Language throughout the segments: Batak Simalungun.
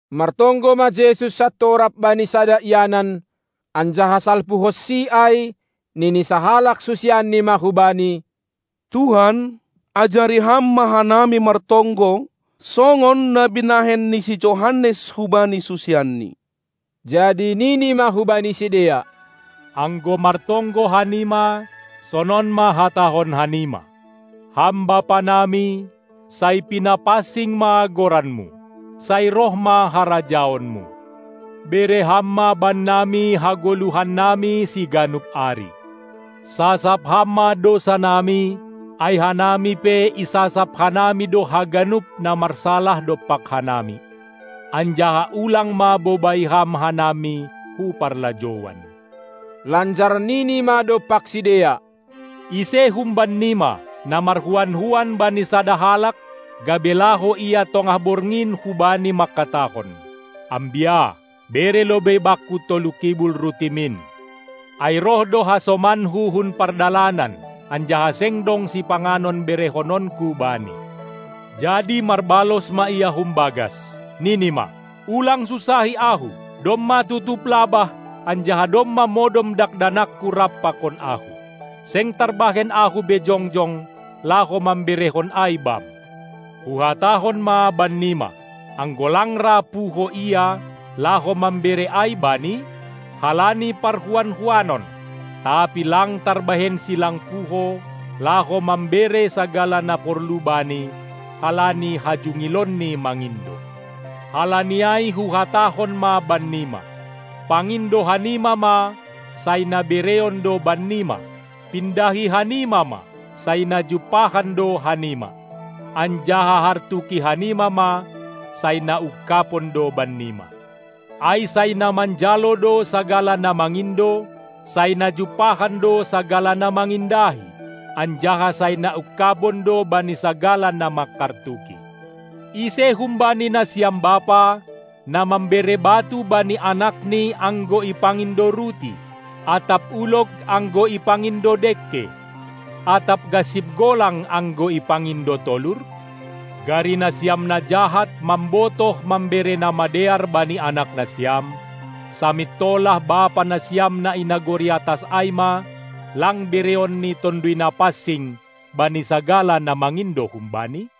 Martonggo ma Jesus santorap bani sada ianan, anjaha salpuhonsi ai, nini sahalak susianni ma hu Bani: Tuhan, ajari Ham ma hanami martonggo, songon na binahen ni si Johannes hubanisusianni. Jadi nini ma hubani sidea: Anggo martonggo hanima, sonon ma hatahon hamina: Ham Bapanami, sai pinapansing ma goranMu. Sai roh ma harajaonMu. Bere Ham ma bannami hagoluhannami siganup ari. Sasap Ham ma dousa nami, ai hanami pe isasap hanami do haganup na marsalah dompak hanami. Anjaha ulang ma bobai Ham hanami hu parlajouan. Lanjar Nini ma dompak sidea: Ise humbannima, na marhuan-huan bani sada halak, gabe laho ia tongah borngin hubani mangkatahon: Ambia, bere lobei bakku tolu kibul rutimin, ai roh do hasomanku hun pardalanan, anjaha seng dong sipanganon berehononku bani. Jadi marbalos ma ia humbagas, nini ma: Ulang sunsahi ahu! Domma tutup labah, anjaha domma modom dakdanakku rap pakon ahu. Seng tarbahen ahu be jongjong, laho mamberehon ai bam. Huhatahon ma bannima: Anggo lang ra puho ia, laho mambere ai bani, halani parhuan-huanon, tapi lang tarbahensi lang puho, laho mambere sagala na porlu bani, halani hajungilonni mangindo. Halani ai huhatahon ma bannima: Pangindo hanima ma, sai na bereon do bannima; pindahi hanima ma, sai na jumpahan do hanima, anjaha hartuki hanima ma, sai na ungkabon do bannima! Ai sai na manjalo do sagala na mangindo, sai na jumpahan do sagala na mangindahi, anjaha sai na ungkabon do bani sagala na mangkartuki. Ise humbani nasiam bapa, na mambere batu bani anakni anggo ipangindo ruti, atap ulog anggo ipangindo dengke, atap gansip golang anggo ipangindo tolur? Gari nasiam na jahat mambotoh mambere na madear bani anak nasiam, samintolah Bapa nasiam na i nagori atas ai ma lang bereonNi Tonduy Napansing bani sagala na mangindo hum Bani?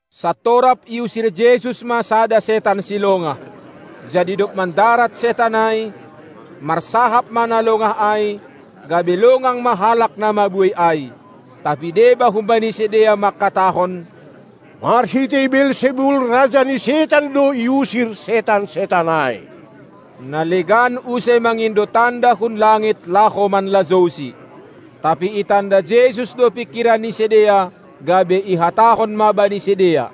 Santorap iusir Jesus ma sada setan silongah. Jadi dob mandarat setan ai, marsahap ma na longah ai, gabe longang ma halak na mabuei ai. Tapi deba humbani sidea mangkatahon: Marhitei Beelsebul, raja ni setan do iusir setan-setan ai. Na legan use mangindo tanda hun langit laho manlajouSi. Tapi itanda Jesus do pingkiran ni sidea, gabe ihatahon ma bani sidea: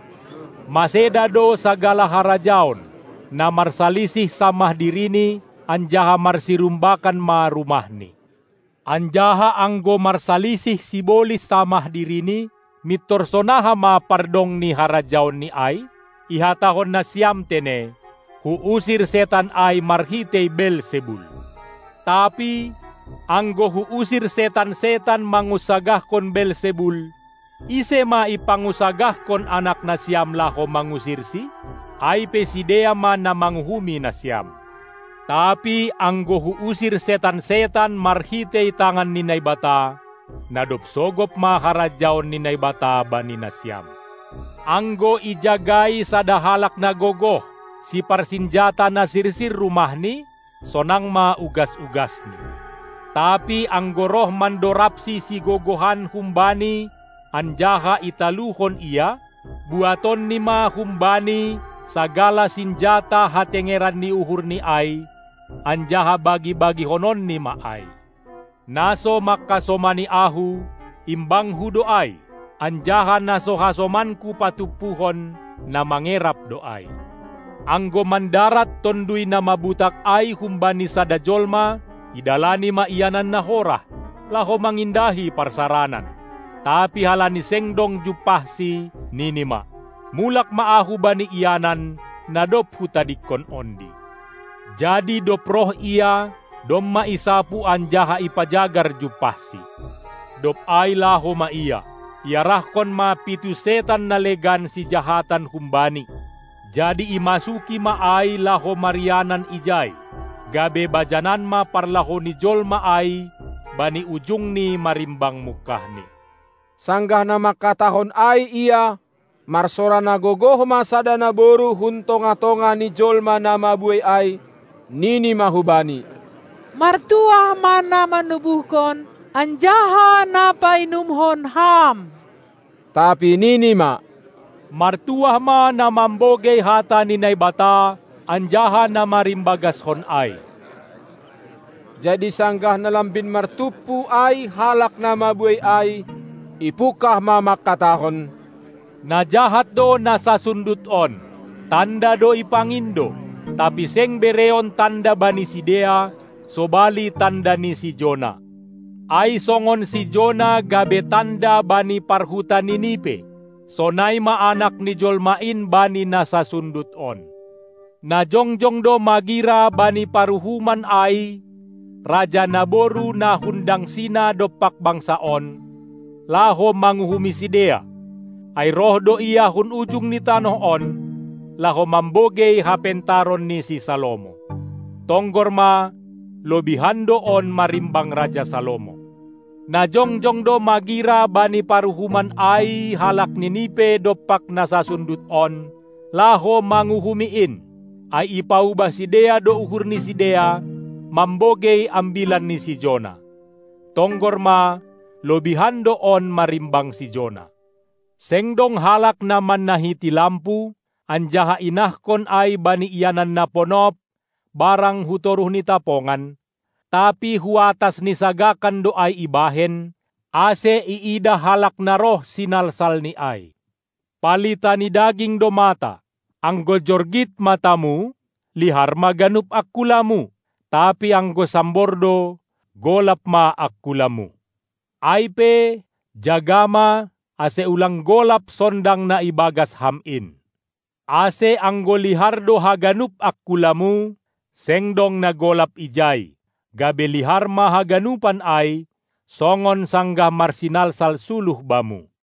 Maseda do sagala harajaon, na marsalisih samah dirini anjaha marsirumbakan ma rumahni. Anjaha anggo marsalisih sibolis samah dirini, mintor sonaha ma pardong ni harajaonni ai? Ihatahon nasiam tene, Huusir setan ai marhitei Beelsebul! Tapi, anggo Huusir setan-setan mangunsagahkon Beelsebul, ise ma ipangunsagahkon anak nasiam laho mangusirsi? Ai pe sidea ma na manguhumi nasiam. Tapi anggo Huusir setan-setan marhitei tangan ni Naibata, na dob sogop ma harajaon ni Naibata bani nasiam. Anggo ijagai sada halak na gogoh, siparsinjata na sirsir rumahni, sonang ma ugas-ugasni. Tapi anggo roh mandorabsi sigogohan humbani anjaha italuhon ia, buatonni ma humbani sagala sinjata hatengeran ni uhurni ai, anjaha bagi-bagihononni ma ai. Na so mangkasomani Ahu, imbangKu do ai, anjaha na so hasomanKu patumpuhon, na mangerap do ai. Anggo mandarat tonduy na mabutak ai humbani sada jolma, idalani ma ianan na horah, laho mangindahi parsaranan, tapi halani seng dong jumpahsi nini ma: Mulak ma ahu bani ianan, na dob hutadingkon ondi. Jadi, dob roh ia, domma isapu anjaha ipajagar jumpahsi. Dob ai laho ma ia, iarahkon ma pitu setan na legan sijahatan humbani, jadi imasuki ma ai laho marianan ijai, gabe bajanan ma parlahou ni jolma ai bani ujungni marimbang mungkahni. Sanggah na mangkatahon ai Ia, marsora na gogoh ma sada naboru hun tongah-tongah ni jolma na mabuei ai, nini ma hu Bani: Martuah ma na manubuhkon anjaha na painumhon Ham! Tapi nini ma: Martuah ma na mambogei hata ni Naibata anjaha na marimbagashon ai! Jadi sanggah na lambin martumpu ai halak na mabuei ai, ipungkah ma mangkatahon: Na jahat do na sasundut on. Tanda do ipangindo, tapi seng bereon tanda bani sidea sobali tanda ni si Jona. Ai songon si Jona gabe tanda bani parhuta Ninipe, sonai ma Anak ni jolma in bani na sasundut on. Na jongjong do magira bani paruhuman ai raja naboru na hundangsina dompak bangsa on, laho manguhumi sidea, ai roh do ia hun ujung ni tanoh on, laho mambogei hapentaron ni si Salomo. Tonggor ma, lobihan do on marimbang raja Salomo. Na jongjong do magira bani paruhuman ai halak Ninipe dompak na sasundut on, laho manguhumi in, ai ipaubah sidea do uhur ni sidea, mambogei ambilan ni si Jona. Tonggor ma, lobihan do on marimbang si Jona. Seng dong halak na mannahiti lampu, anjaha inahkon ai bani ianan na ponop barang hu toruh ni tapongan, tapi hu atas ni sagakan do ai ibahen, ase iidah halak na roh sinalsalni ai. Palita ni daging do mata. Anggo jorgit matamu, lihar ma ganup angkulamu, tapi anggo sambor do, golap ma angkulamu. Ai pe, jaga ma, ase ulang golap sondang na ibagas ham in. Ase anggo lihar do haganup angkulamu, seng dong na golap ijai, gabe lihar ma haganupan ai, songon sanggah marsinalsal suluh bamu.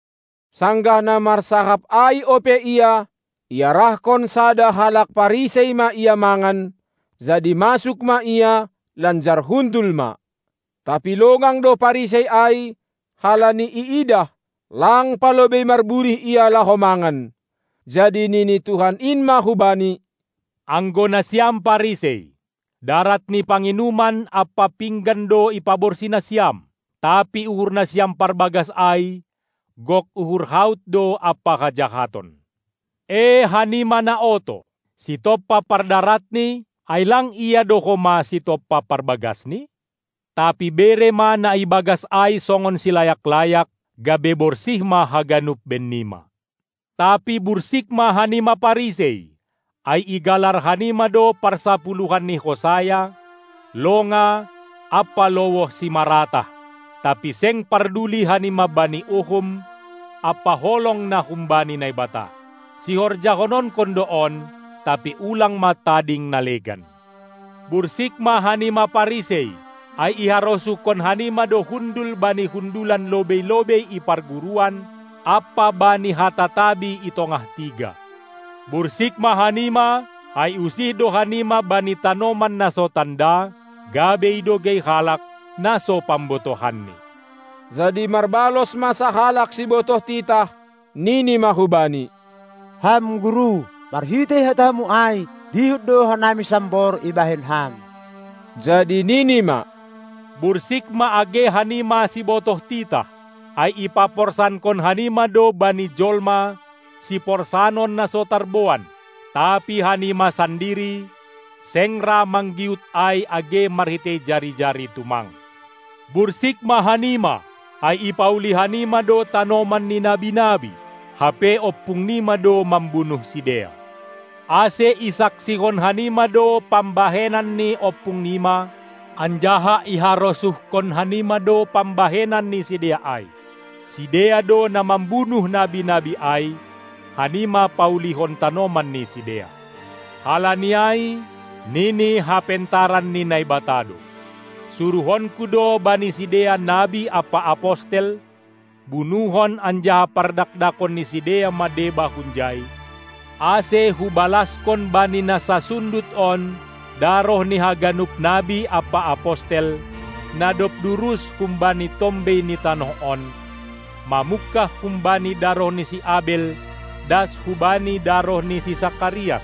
Sanggah na marsahap ai ope Ia, iarahkon sada halak Parisei ma Ia mangan; jadi masuk ma Ia lanjar hundul ma. Tapi longang do Parisei ai, halani iidah, lang palobei marburih Ia laho mangan. Jadi nini Tuhan in ma hubani: Anggo nasiam Parisei, darat ni panginuman ampa pinggan do ipaborsih nasiam; tapi uhur nasiam parbagas ai gok uhur haut do ampa hajahaton. Ee, hanima na oto! Sitompa pardaratni, ai lang Ia do homa sitompa parbagasni? Tapi bere ma na ibagas ai songon silayak-layak, gabe borsih ma haganup bennima. Tapi bursik ma hanima Parisei, ai igalar hanima do parsapuluhan ni hosaya, longa ampa lowoh simaratah, tapi seng parduli hanima bani uhum ampa holong na humbani Naibata. Sihorjahononkon do on, tapi ulang ma tading na legan. Bursik ma hanima Parisei, ai iharosuhkon hanima do hundul bani hundulan lobei-lobei i parguruan ampa bani hata tabi i tongah tiga. Bursik ma hanima, ai usih do hanima bani tanoman na so tanda, gabe idogei halak, na so pambotohanni. Jadi marbalos ma sahalak sibotoh titah, nini ma hu Bani: Ham Guru, marhitei hataMu ai dihut do hanami sambor ibahen Ham. Jadi nini ma: Bursik ma age hanima sibotoh titah, ai ipaporsankon hanima do bani jolma siporsanon na so tarboan, tapi hanima sandiri seng ra manggiut ai age marhitei jari-jari tumang. Bursik ma hanima, ai ipauli hanima do tanoman ni nabi-nabi, hape ompung nima do mambunuh sidea. Ase isaksihon hanima do pambahenan ni ompung nima, anjaha iharosuhkon hanima do pambahenan ni sidea ai; sidea do na mambunuh nabi-nabi ai, hanima paulihon tanoman ni sidea. Halani ai nini hapentaran ni Naibata do: SuruhonKu do bani sidea nabi ampa apostel, bunuhon anjaha pardakdakon ni sidea ma deba hunjai, ase Hubalaskon bani na sasundut on daroh ni haganup nabi ampa apostel, na dob durus humbani tombei ni tanoh on, mamungkah humbani daroh ni si Abel das hubani daroh ni si Sakarias,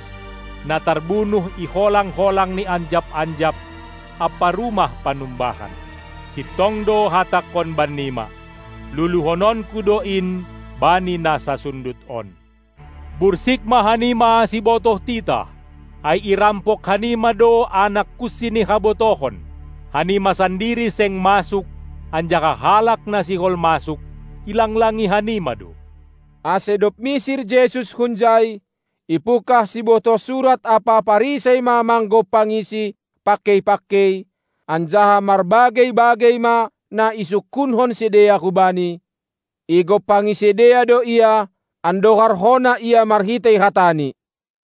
na tarbunuh i holang-holang ni anjap-anjap ampa rumah panumbahan. Sintong do hatangKon bannima: Luluhononku do in bani na sasundut on. Bursik ma hanima sibotoh titah, ai irampok hanima do anak kunsi ni habotohon. Hanima sandiri seng masuk, anjaha halak na sihol masuk, ilanglangi hanima do. Ase dob misir Jesus hunjai, ipungkah sibotoh surat ampa Parisei ma manggompangiSi pangkei-pangkei, anjaha marbagei-bagei ma na isungkunhon sidea hu Bani; igompangi sidea do Ia, andohar hona Ia marhitei hataNi.